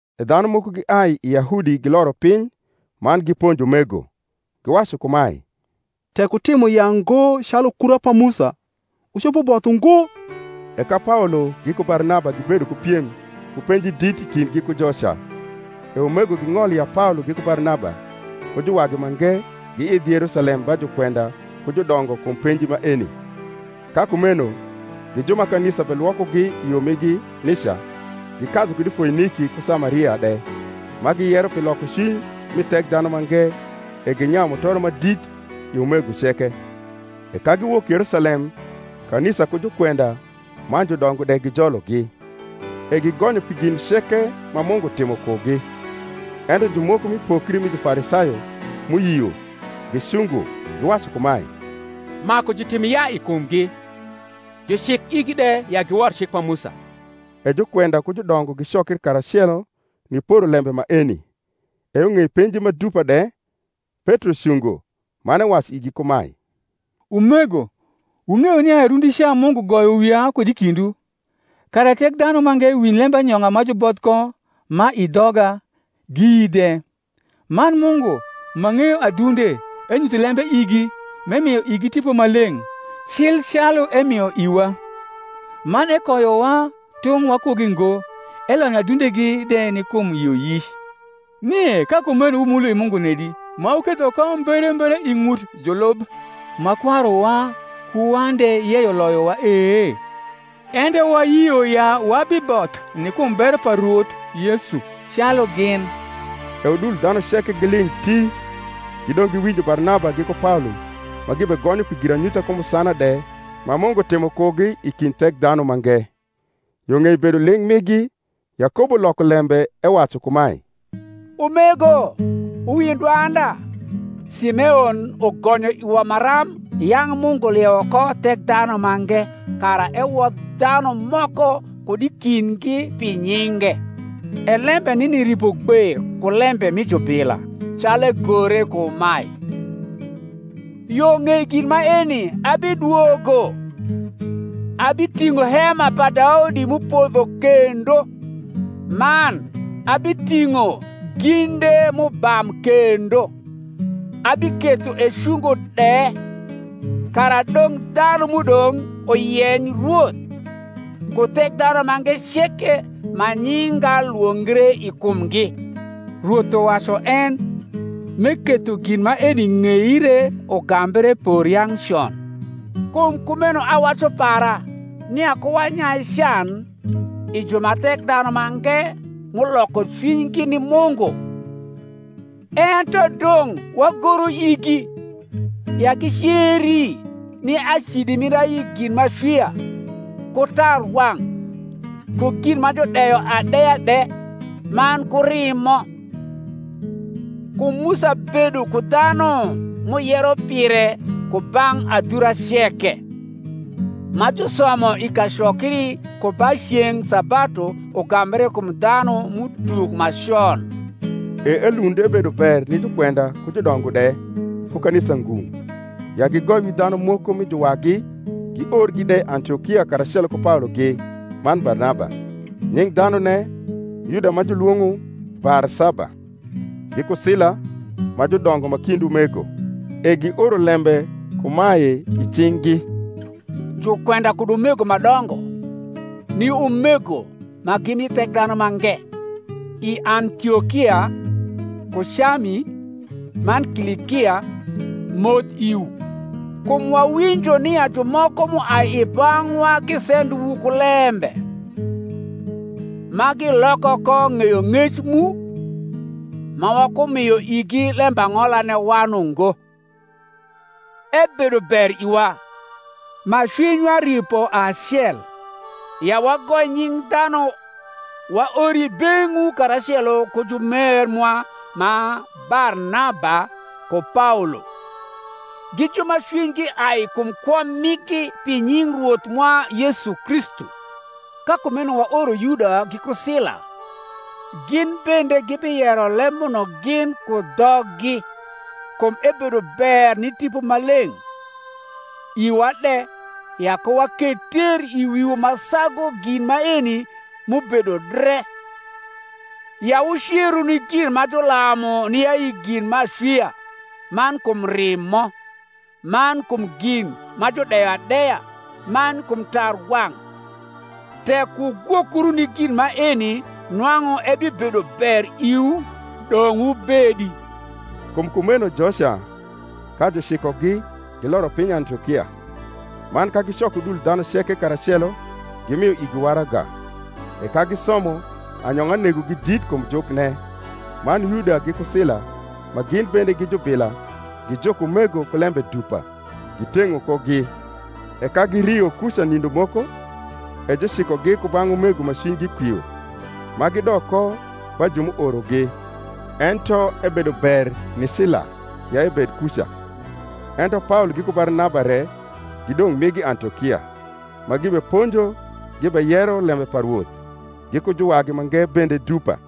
E dhanu moko giai i Yahudi giloro piny man giponjo umego, giwacu kumae, Tek wutimo yaa ngo calu kura pa Musa, wucopo both ungo. E ka Paolo giku Barnaba gibedo ku piem ku penji dit i kindgi ku joca, e umego ging’olo ya Paolo giku Barnaba, ku juwagi mange, giidh Yerusalem ba jukwenda ku judongo kum penji maeni. Ka kumeno, gi ju ma kanisa belwokogi i yo migi nica, gikadhu kud i Foiniki ku Samaria de, ma giyero pi lokocwiny mi Thekdhanumange: e ginyayu mutoro ma dit i umego ceke. E ka giwok Yerusalem kanisa ku jukwenda man judongo de gijologi, e gigonyo pi gin ceke ma Mungu timo kugi. Ento jumoko mi pokri mi Jufarisayo m’uyio gicungo, giwacu kumae, Maku jutim yaa i kumgi, jucik igi de ya giwor cik pa Musa. E jukwenda ku judongo gicokri karacelo niporo lembe maeni. E yo ng’ei penji ma dupa de, Petro cungo, man ewacu igi kumae, Umego, wung’eyo nia rundica Mungu goyo wia kud i kindwu, kara Thekdhanumange winj lembanyong’a ma juboth ko ma i dhoga, giyi de. Man Mungu, ma ng’eyo adunde, enyutho lembe igi, m’emio igi Tipo Maleng’, cil calu emio iwa; man ekoyowa tung’ wakugi ngo, elonyo adundegi de ni kum yioyic. Nie ka kumeno wumulo i Mungu nedi, ma wuketho ko mberembere i ng’ut julub ma kwaruwa ku wan de yeyo loyowa e? Ento wayio ya wabiboth ni kum bero pa Rwoth Yesu, calu gin. E udul dhanu ceke giling’ ti; gidong’ giwinjo Barnaba giku Paolo ma gibegonyo pi giranyutha ku musana de ma Mungu timo kugi i kind Thekdhanumange. Yo ng’ei bedo ling’ migi, Yakobo loko lembe, ewacu kumae, Umego, wuwinj dwanda: Simeon ugonyo iwa maram yang’ Mungu liewo ko Thekdhanumange ku kwong’a kara ewodh dhanu moko kud i kindgi pi nyinge. E lembe nini ripo gbe ku lembe mi jubila; calu egore kumae, Yo ng’ei gin maeni abidwogo, Abiting’o hema pa Daudi m’upodho kendo; Man abiting’o ginde m’ubam kendo, Abiketho ecungo de: Kara dong’ dhanu m’udong’ uyeny Rwoth, Ku Thekdhanumange ceke ma nyinga lwongre i kumgi, Rwoth uwacu en, m’eketho gin maeni ng’eire ugambre por yang’ con. Kum kumeno awacu para, nia ku wanyai can i ju ma Thekdhanumange m’uloko cwinygi ni Mungu; ento dong’ wagoru igi, ya giceri ni acidi mir ayi gin m’acwia, ku tarwang’, ku gin ma judeyo adeya de, man ku rimo. Kum Musa bedo ku dhanu m’uyero pire ku bang’ adhura ceke, ma jusomo i kacokri ku ba ceng’ sabatu ugambre kum dhanum’utuk ma con. E elund ebedo ber ni jukwenda ku judongo de, ku kanisa ngung’, ya gigoi wi dhanu moko mi juwagi, giorgi de Antiokia karacelo ku Paologi man Barnaba; nying’ dhanune, Yuda ma julwong’o Barsaba, giku Sila, ma judongo ma kind umego: e gioro lembe kumae i cing’gi, Jukwenda kud umego ma dongo, ni umego ma gi mi Thekdhanumange i Antiokia, ku Cami, man Kilikia, moth iwu: Kum wawinjo nia jumoko m’uai i bang’wa gisendowu ku lembe, ma giloko ko ng’eyong’ec mu; ma wakumio igi lembang’olane wan ungo; ebedo ber iwa, ma cwinywa ripo acel, ya wagoi nying’ dhanu waor i beng’wu karacelo ku jumer mwa ma Barnaba ku Paolo, gi ju ma cwinygi ai kum kwo migi pi nying Rwoth mwa Yesu Kristu. Ka kumeno waoro Yuda giku Sila, gin bende gibiyero lembuno gin ku dhoggi. Kum ebedo ber ni Tipo Maleng’, iwa de, ya ku waketh ter i wiwu ma sagu gin maeni m’ubedo dre: ya wuceru ni gin ma julamu ni ayi gin m’acwia, man kum rimo, man kum gin ma judeyo adeya, man kum tarwang’; tek wugwokru ni gin maeni nwang’u ebibedo ber iwu. Dong’ wubedi. Kum kumeno joca, ka jucikogi, giloro piny Antiokia; man ka gicoko udul dhanu karacelo, gimio igi waraga. E ka gisomo, anyong’a negogi dit kum jukne. Man Yuda giku Sila, ma gin bende gi jubila, gijuko umego ku lembe dupa, giteng’o kogi. E ka girio kuca nindo moko, e jucikogi ku bang’ umego ma cwinygi kwio ma gidok ko ba ju m’uorogi. Ento ebedo ber ni Sila ya ebed kuca. Ento Paolo giku Barnaba re gidong’ migi Antiokia, ma gibeponjo gibeyero lembe pa Rwoth, giku juwagi mange bende dupa.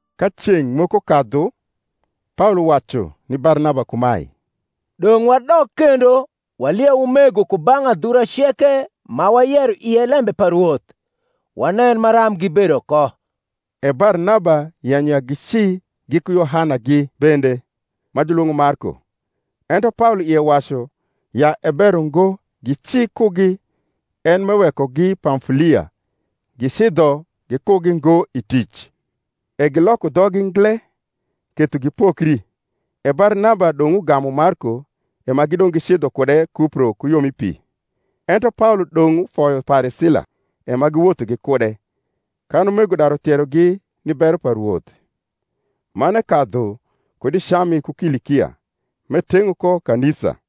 Ka ceng’ moko kadhu Paolo wacu ni Barnaba kumae, Dong’ wadok kendo walieu umego ku bang’ adhura ceke ma wayero ie lembe pa Rwoth, wanen maram gibedo ko. E Barnaba yenyo ya gici giku Yohanagi bende, ma julwong’e Marko. Ento Paolo ie wacu ya e ber ungo gici kugi en m’ewekogi Pamfulia, gicidho gikugi ngo i tic. E giloko dhoggi ngle, ketho gipokri, e Barnaba dong’ ugamu Marko, e ma gidong’ gicidho gikude Kupro ku yo mi pi: ento Paolo dong’ ufoyo pare Sila, e ma giwotho gikude, kan umego daru thierogi ni bero pa Rwoth. Man ekadhu kud i Cami ku Kilikia, m’eteng’o ko kanisa.